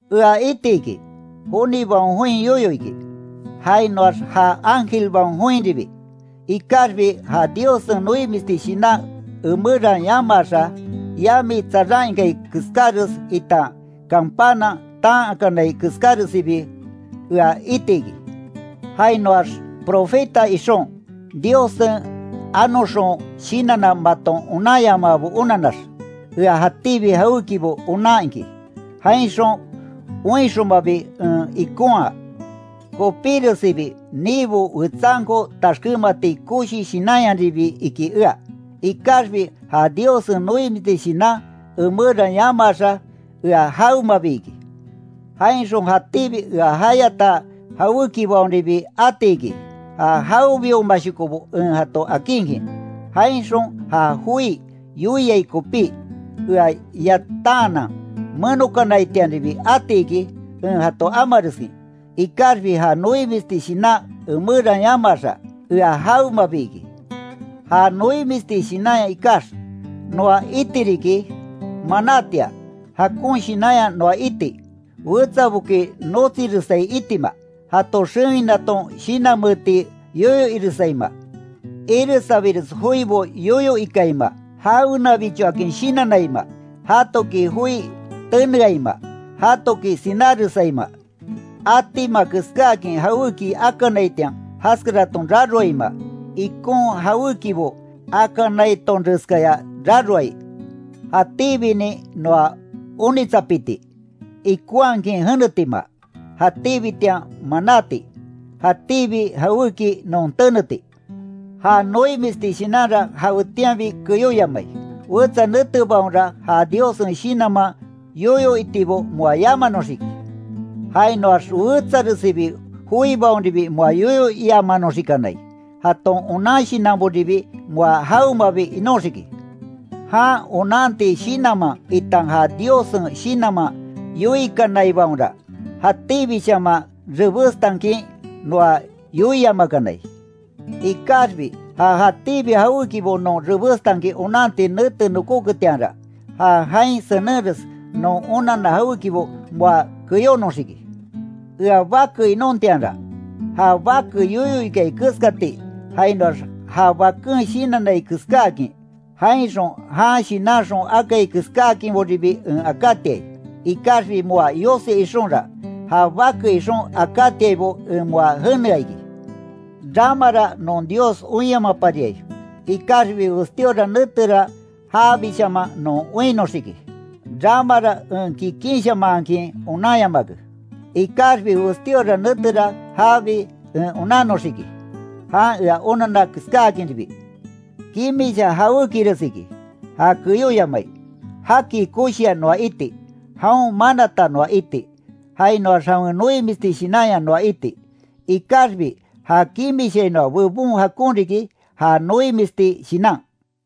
Ea iti iki, jonibaon join yoyo iki, jainoax ja ángelbaon joinribi, ikaxbi ja Diossen noimisti shinan emeran yamaaxa, yami tsaran ikai keskáres itan canpana taan akanai keskáresibi ea itiki, jainoax profeta ixon, Diossen anoxon shinanna maton onanyamaabo onanax, ea jatíbi jawékibo onan iki, jainxon oinxonmabi en ikonhaa, kopíresibi niibo wetsanko taxkémati koshi shinanyaribi iki ea, ikaxbi ja Diossen noimisti shinan emeran yamaaxa ea jawemabi iki. Jainxon jatíbi ea jayata jawékibaonribi atiki, ja jawebiomashokobo en jato akinkin, jainxon ja joi yoiai kopí, ea yatanhanan menokanaitianribi atiki, en jato amareskin, ikaxbi ja noimisti shinan emeran yamaaxa, ea jawemabi iki. Ja noimisti shinanya ikax, noa iti riki, manátia, jakon shinanya noa iti, wetsaboki notsiresai itima, jato xewinaton shinanmeeti yoyo iresaima, iresabires joibo yoyo ikaima, jawenabichoakin shinannaima, jatoki joi teneaima, jatoki sináresaima, atima keskáakin jawéki akanaitian jaskaraton raroaima, ikon jawékibo akanaitonreskaya raroai. Jatíbinin noa onitsapiti, ikonhakin jenetima, jatíbitian manáti, jatíbi jawéki non teneti. Ja noimisti shinanra jawetianbi keyoyamai, wetsa netebaonra ja Diossen shinanman yoyo itibo moa yamanoxiki, jainoax wetsaresibi joibaonribi moa yoyo iamanoxikanai, jaton onan shinanboribi moa jawemabi inoxiki. Jan onanti shinanman itan ja Diossen Shinanman yoikanaibaonra, jatíbishaman rebestankin noa yoiamakanai, ikaxbi ja jatíbi jawékibo non rebestankin onanti nete nokoketianra, ja jain senenres non onanna jawékibo moa keyónoxiki. Ea bake inontianra, ja bake yoyo ikai keskati jainoax ja baken shinannai keskáakin, jainxon jan shinanxon akai keskáakinboribi en akátiai. Ikaxbi moa yosi ixonra, ja bake ixon akátiaibo en moa jenea iki. Ramara non Dios oinyamapariai, ikaxbi westíora netera jabishaman non oinnoxiki. Ramara en kikinshamahankin onanyamake, ikaxbi westíora netera jabi en onannoxiki, jan ea onanna keskáakinribi. Kimisha jawékires iki, ja keyóyamai, jaki koshia noa iti, jaon manata noa iti, jainoax jawen noimisti shinanya noa iti. Ikaxbi ja kimishainoa bebon jakon riki, ja noimisti shinan.